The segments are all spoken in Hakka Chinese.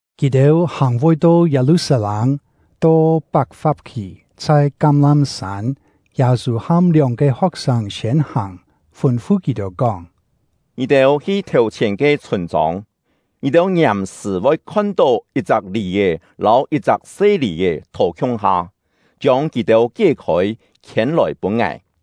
Kì-têu hàng voi to Yâ-lu-sat-lâng, to Pak-fap-khì, chhai Kám-lám-sân, Yâ-sû ham lióng-ke ho̍k-sâng siên hàng, fûn-fu kì-têu kóng: “Ngì-têu hi thèu-chhièn ke chhûn-chông. Ngì-têu ngiàm-sṳ̀ voi khon-tó yit-chak lì-è lâu yit-chak se lì-è thò khiung-ha; chiông kì-têu kié-khôi, khiên-lòi pûn ngài.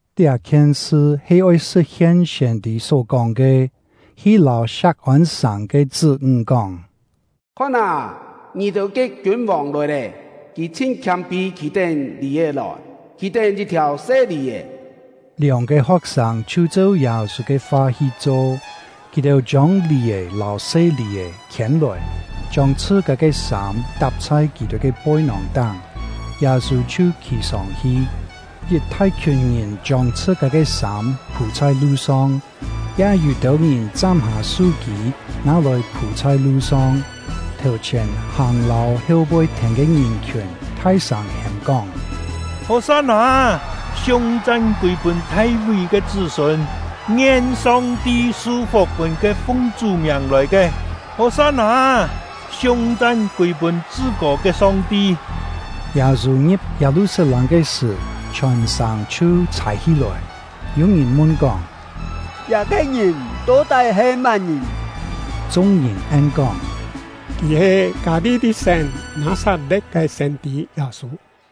Liá-khien sṳ he oi sṳ̍t-hien siên-tî só kóng ke: Hi lâu Siak-ôn-sàng ke chṳ́-ńg kóng: “Khon â, ngì-têu ke kiûn-vòng lòi lé! Kì chhin khiâm-pî khì-tén lì-è lòi, khì-tén yit-thiàu se lì-è.” Lióng-ke ho̍k-sâng chhiu cheu Yâ-sû ke fa hi cho. Kì-têu chiông lì-è lâu se lì-è khiên-lòi, chiông chhṳ-kâ ke sâm tap chhai kì-têu ke poi-nòng-táng, Yâ-sû chhiu khì sông-hi. Yit thai-khiùn ngìn chiông chhṳ-kâ ke sâm phû chhai lu-song, ya yû-têu ngìn chám-hâ su-kî, nâ-lòi phû chhai lu-song. Thèu-chhièn hàng lâu heu-poi thèn ke ngìn-khiùn thai-sâng hêm-kóng: “Hò-san-nâ! Siung-chan kûi-pûn Thai-ví ke chṳ́-sûn! Ngien Song-ti su-fuk pûn ke fung Chú miàng lòi ke! Hò-san-nâ! Siung-chan kûi-pûn Chṳ-kô ke Song-ti!” Yâ-sû ngi̍p Yâ-lu-sat-lâng ke sṳ̀, chhiòn sàng chhiu chhài hí-lòi. Yû ngìn mun-kóng: “Liá-ke ngìn to-tái he má-ngìn?” Chung-ngìn en-kóng: “Kì he Kâ-li-li-sén Nâ-sat-le̍t ke siên-tî Yâ-sû.”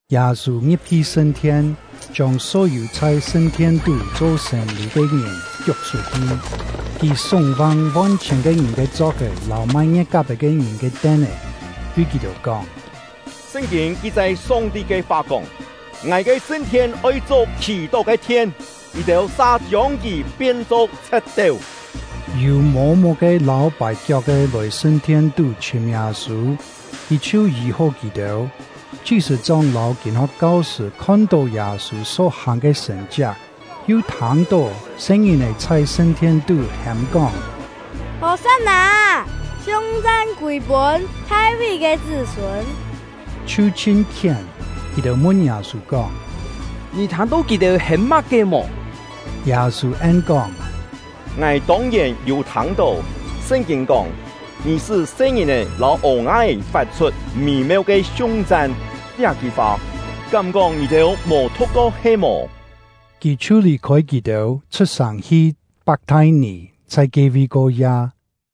Yâ-sû ngi̍p-hi sṳn-thien, chiông só-yû chhai sṳn-thien-tú cho sên-lî ke ngìn kiuk chhut-hi. Kì súng-vang von-chhièn ke ngìn ke chok-è lâu mai ngie̍t-kap-è ke ngìn ke ten-é, tui kì-têu kóng: “Sṳn-kîn ki-chai Song-ti ke fa kóng: ‘Ngài ke sṳn-thien oi cho khì-tó ke thien’, ngì-têu sa chiông kì pien-cho chhe̍t-teu!” Yû mô-muk-ke lâu pài-kiok-ke lòi sṳn-thien-tú chhìm Yâ-sû; kì chhiu yî-hó kì-têu. Chi-sṳ̂-chóng lâu kîn-ho̍k kau-sṳ̂ khon-tó Yâ-sû só-hàng ke sṳ̀n-chiak, yu thâng-tó se-ngìn-è chhai sṳn-thien-tú hêm-kóng: “Hò-san-nâ! Siung-chan kûi-pûn Thai-ví ke chṳ́-sûn!” chhiu chhin khién. Kì-têu mun Yâ-sû kóng: “Ngì thâng-tó kì-têu hêm má-ke mò?” Yâ-sû en-kóng: “Ngài tông-yèn yû thâng-tó. Sṳn-kîn kóng: ‘Ngì sṳ́ se-ngìn-è lâu ô-nga-é fat-chhut mî-meu ke siung-chan’ liá-ki fa, kám-kóng ngì-têu mò thu̍k-ko he-mò?” Kì chhiu lì-khôi kì-têu, chhut-sàng hi Pak-thai-nì, chhai ke-vi ko-ya.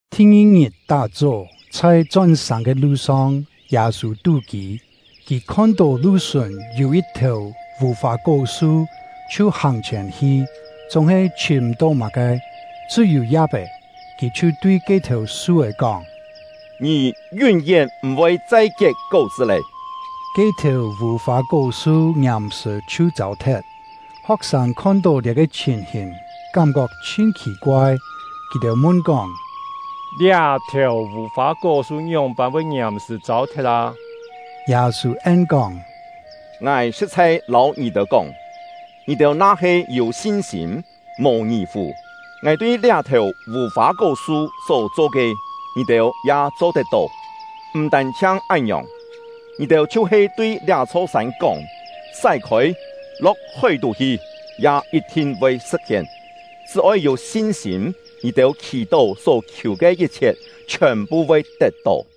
Thi-ngi-ngit tá-chó, chhai chón-sàng ke lu-song, Yâ-sû tú-kî. Kì khon-tó lu-sùn yû yit-thèu vù-fâ-kó-su, chhiu hàng-chhièn hi, chúng-he chhìm m̀-tó má-ke, chṳ́-yû ya̍p-é. Kì chhiu tui ke-thèu su-é kóng: “Ngì yún-yén m̀-voi chai kiet kó-chṳ́ lé!” Ke-thèu vù-fâ-kó-su ngiàm-sṳ̀ chhiu châu-thet. Ho̍k-sâng khon-tó liá-ke chhìn-hìn, kám-kok chhin khì-koai. Kì-têu mun-kóng: “Liá-thèu vù-fâ-kó-su ngióng-pân voi ngiàm-sṳ̀ châu-thet â?” Yâ-sû en-kóng: “Ngài sṳ̍t-chhai lâu ngì-têu kóng, ngì-têu na-he yû sin-sîm, mò ngì-fù, ngài tui liá-thèu vù-fâ-kó-su só cho ke, ngì-têu ya cho-tet-tó. M̀ tân-chhiang án-ngiòng, ngì-têu chhiu-he tui liá-chho sân kóng: ‘Sái-khôi, lo̍k hói-tú hi!’ ya yit-thin voi sṳ̍t-hien. Chṳ́-oi yû sin-sîm, ngì-têu khì-tó só khiù ke yit-chhiet chhiòn-phu voi tet-tó.”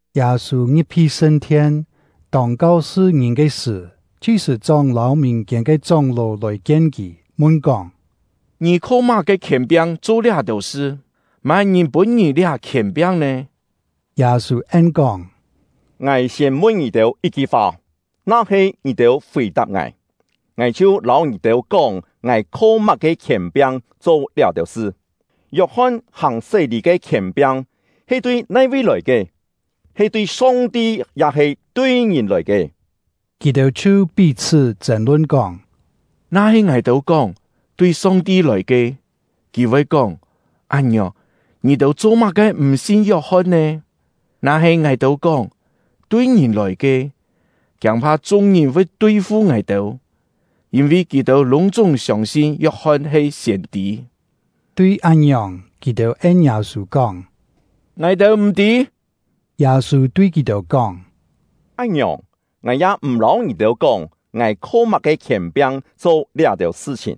Yâ-sû ngi̍p-hi sṳn-thien, tông kau-sṳ ngìn ke sṳ̀, chi-sṳ̂-chóng lâu mìn-kiên ke chóng-ló lòi-kien kì, mun-kóng: “Ngì kho má-ke khièn-piang cho liá-têu sṳ? Má-ngìn pûn ngì liá khièn-piang nè?” Yâ-sû en-kóng: “Ngài siên mun ngì-têu yit-ki fa, na-he ngì-têu fì-tap ngài, ngài chhiu lâu ngì-têu kóng ngài kho má-ke khièn-piang cho liá-têu sṳ. Yok-hon hàng sé-lî ke khièn-piang he tui nai-vi lòi ke? He tui Song-ti ya-he tui ngìn lòi ke?” Kì-têu chhiu pí-chhṳ́ chên-lun, kóng: “Na-he ngài-têu kóng: ‘Tui Song-ti lòi ke’, kì voi kóng: ‘Án-ngiòng, ngì-têu cho-má-ke m̀ sin Yok-hon nè?’ Na-he ngài-têu kóng: ‘Tui ngìn lòi ke’, kiâng-pha chung-ngìn voi tui-fu ngài-têu, yîn-vi kì-têu lûng-chúng siông-sin Yok-hon he siên-tî.” Tui án-ngiòng, kì-têu en Yâ-sû kóng: “Ngài-têu m̀ tî.” Yâ-sû tui kì-têu kóng: “Án-ngiòng, ngài ya m̀ lâu ngì-têu kóng ngài kho má-ke khièn-piang cho liá-têu sṳ-chhìn.”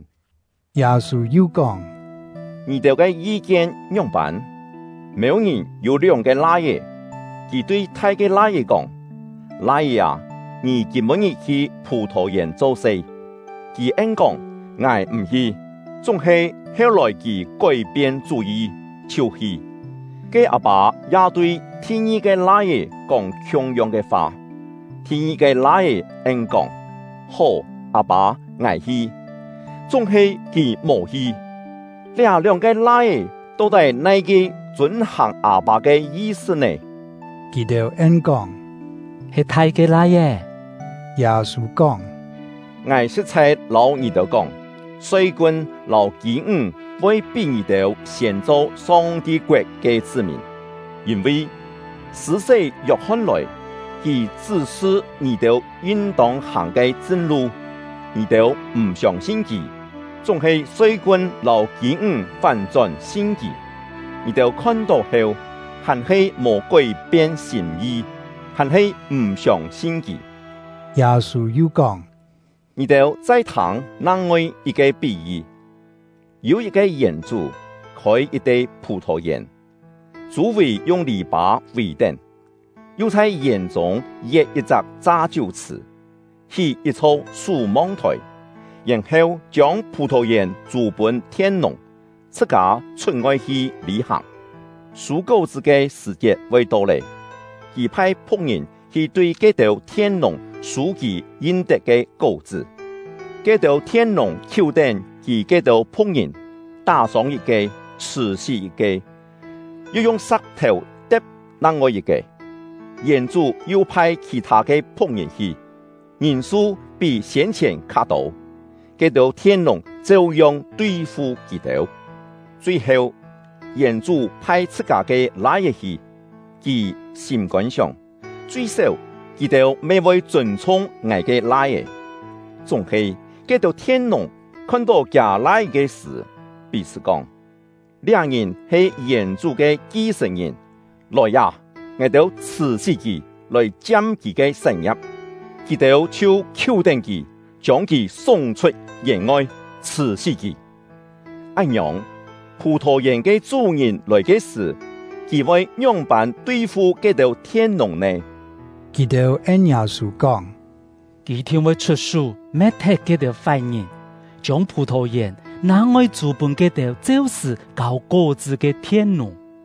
Yâ-sû yu kóng: “Ngì-têu ke yi-kien ngióng-pân? Mêu-ngìn yû lióng-ke lai-é. Kì tui thai ke lai-é kóng: ‘Lai-é â, ngì kîm-pû-ngit hi phù-thò-yèn cho-se.’ Kì en-kóng: ‘Ngài m̀ hi.’ Chúng-he heu-lòi kì kói-pien chú-yi, chhiu hi. Ke â-pâ ya tui thi-ngi-ke lai-é kóng khiung-yong ke fa. Thi-ngi-ke lai-é en-kóng: ‘Hó, â-pâ, ngài hi.’ Chúng-he kì mò hi. Liá lióng-ke lai-é to-tái nai-ke chûn-hàng â-pâ ke yi-sṳ nè?” Kì-têu en-kóng: “He thai ke lai-é.” Yâ-sû kóng: “Ngài sṳ̍t-chhai lâu ngì-têu kóng, soi-kun lâu kî-ńg voi pí ngì-têu siên cho Song-ti koet ke chṳ́-mìn. Yîn-vi Sṳ̂-sé Yok-hon lòi, kì chṳ́-sṳ ngì-têu yin-tông hàng ke chṳn-lu, ngì-têu m̀ siông-sin kì; chúng-he soi-kun lâu kî-ńg fán-chón sin kì. Ngì-têu khon-tó heu, hàn-he mò kói-pien sîm-yi, hàn-he m̀ siông-sin kì.” Yâ-sû yu kóng: “Ngì-têu chai thâng nang-ngoi yit-ke pí-yi! Yû yit-ke yèn-chú, khôi yit-te phù-thò-yèn, chû-vì yung lì-pâ vì-tén, yu chhai yèn-chûng yet yit-chak cha-chiú-chhṳ̀, hí yit-chho sú-mong-thòi, yèn-heu chiông phù-thò-yèn chû pûn thien-nùng, chhṳ-kâ chhut-ngoi hi lî-hàng. Sû kó-chṳ́ ke sṳ̀-chiet voi to lé, kì phai phu̍k-ngìn hi tui ke-têu thien-nùng sû kì yin-tet ke kó-chṳ́. Ke-têu thien-nùng khiú-tén kì ke-têu phu̍k-ngìn, tá-sông yit-ke, chhṳ̀-sí yit-ke, yu yung sa̍k-thèu te̍p nang-ngoi yit-ke. Yèn-chú yu phai khì-thâ ke phu̍k-ngìn hi, ngìn-su pí siên-chhièn kha-tô; ke-têu thien-nùng cheu-yong tui-fu kì-têu. Chui-heu, yèn-chú phai chhṳ-kâ ke lai-é hi. Kì sîm-kôn sióng: ‘Chui-séu, kì-têu me voi chûn-chhung ngài ke lai-é.’ Chúng-he ke-têu thien-nùng khon-tó kiâ lai-é ke sṳ̀, pí-chhṳ́ kóng: ‘Liá ngìn he yèn-chú ke ki-sṳ̀n-ngìn; lòi â, ngài-têu chhṳ̀-sí kì, lòi chiam kì ke sán-ngia̍p!’ Kì-têu chhiu khiú-tén kì, chiông kì súng-chhut yèn-ngoi, chhṳ̀-sí kì. “Án-ngiòng, phù-thò-yèn ke chú-ngìn lòi ke sṳ̀, kì voi ngióng-pân tui-fu ke-têu thien-nùng nè?” Kì-têu en Yâ-sû kóng: “Kì yit-thin voi chhut-sú me̍t-thet ke-têu fái-ngìn, chiông phù-thò-yèn nang-ngoi chû pûn ke-têu cheu-sṳ̀ kâu kó-chṳ́ ke thien-nùng.”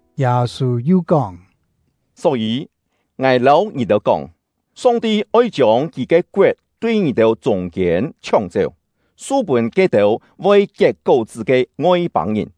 Yâ-sû yu kóng: “Só-yî, ngài lâu ngì-têu kóng, Song-ti oi chiông Kì ke koet tui ngì-têu chûng-kiên chhióng-chéu, su pûn ke-têu voi kiet kó-chṳ́ ke Ngoi-pâng-ngìn.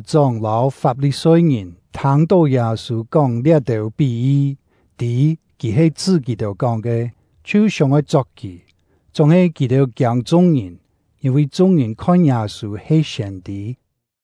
Ke-têu chi-sṳ̂-chóng lâu Fap-li-soi-ngìn thâng-tó Yâ-sû kóng liá-têu pí-yi, tî kì he chṳ́ kì-têu kóng ke, chhiu sióng-oi chok kì. Chúng-he kì-têu kiâng chung-ngìn, yîn-vi chung-ngìn khon Yâ-sû he siên-tî.